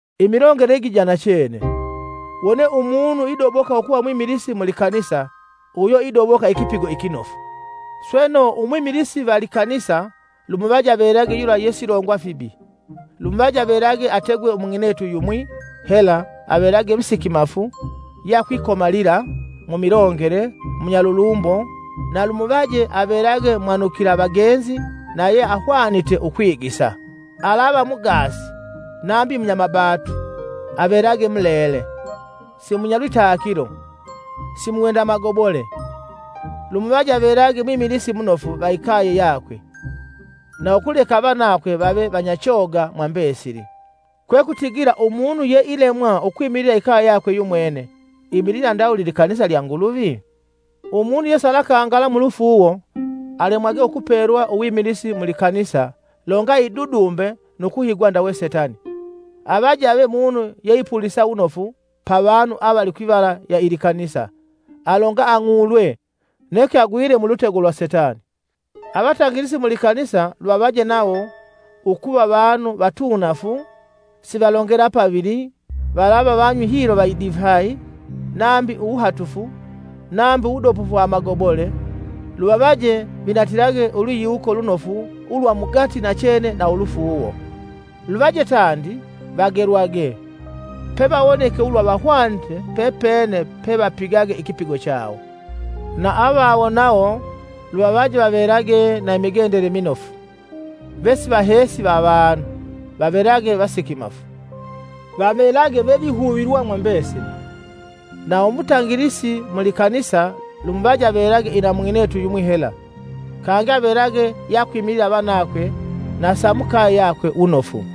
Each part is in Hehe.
Imigendele igi ja nachene: Wone umunu idoboka ukuva mwimilisi mu likanisa, uyo idoboka ikipigo ikinofu. Sweno umwimilisi va likanisa lumuvaje avelage yula yesilongwa fibi; lumuvaje avelage ategwe mung'inetu yumwi hela avelage musikimafu yeakwikomalila, mumilongele, munyalulumbo; na lumuvaje avelage mwanukila vagenzi na yeahwanite ukwigisa; alava mugaasi nambi munyamabatu, avelage mulele, simunyalwitakilo, simuwenda amagobole, lumuvaje avelage mwimilisi munofu va ikaye yakwe na ukuleka avanakwe vave vanyachoga mwa mbesili. Kwekutigila umunu peilemwa ukwimilila ikaye yakwe yumwene imilila ndawuli likanisa lya Nguluvi? Umunu yesalakangala mulufuuwo alemwagwe ukupelwa uwimilisi mu likanisa longa idudumbe nu kuhigwa ndawe Setani; Avaje ave munu yeipulisa wunofu pa vanu avali kwivala ya ilikanisa, alonga ang'ulwe neke agwile mulutego lwa setani? Avatangilisi mu likanisa luvavaje nawo, ukuva vanu vatuunafu sivalongela pavili valava vanywi hilo va idifayi, nambi uwuhatufu, nambi uwudobofu wa amagobole; luvavaje vinatilage ulwiyiwuko lunofu ulwa mugati nachene na ulufuuwo. Lwivaje tandi, vagelwage, pevawonike ulwa vahwanite pepene pevapigage ikipigo chawo. Na avavawo nawo, luvavaje vavelage na imigendele minofu, vesivaheesi va avanu, vavelage vasikimafu; vavelage vevihuvilwa mwa mbesili. Na umutangilisi mu likanisa lumuvaje avelage ina mung'inetu yumwi hela, kangi avelage yeakwimilila avanakwe na sa mukaye yakwe wunofu.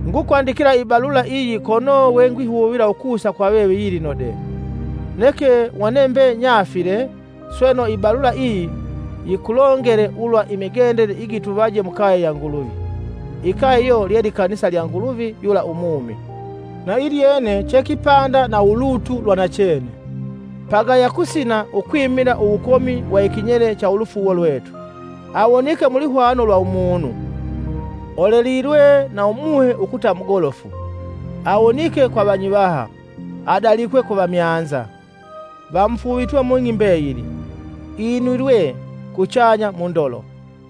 Ngukwandikila ibalula iyi kono we ngwihuvila ukusa kwa veve yilino de. Neke wone mbe nyaafile, sweno, ibalula iyi yikulongele ulwa imigendele igituvaje mukaye ya Nguluvi, ikaye iyo lye likanisa lya Nguluvi yula umumi, na ilyene che kipanda na ulutu lwanachene. Pagaya kusina ukwimila uwukomi wa ikinyele cha ulufuuwo lwetu. Awonike mu lwihwano lwa umunu, olelilwe na Umuhe ukuta mugolofu, awonike kwa vanyivaha, adalikwe ku vamyanza, vamufuuvitwe mung'i mbeyili inwilwe kuchanya mu ndolo.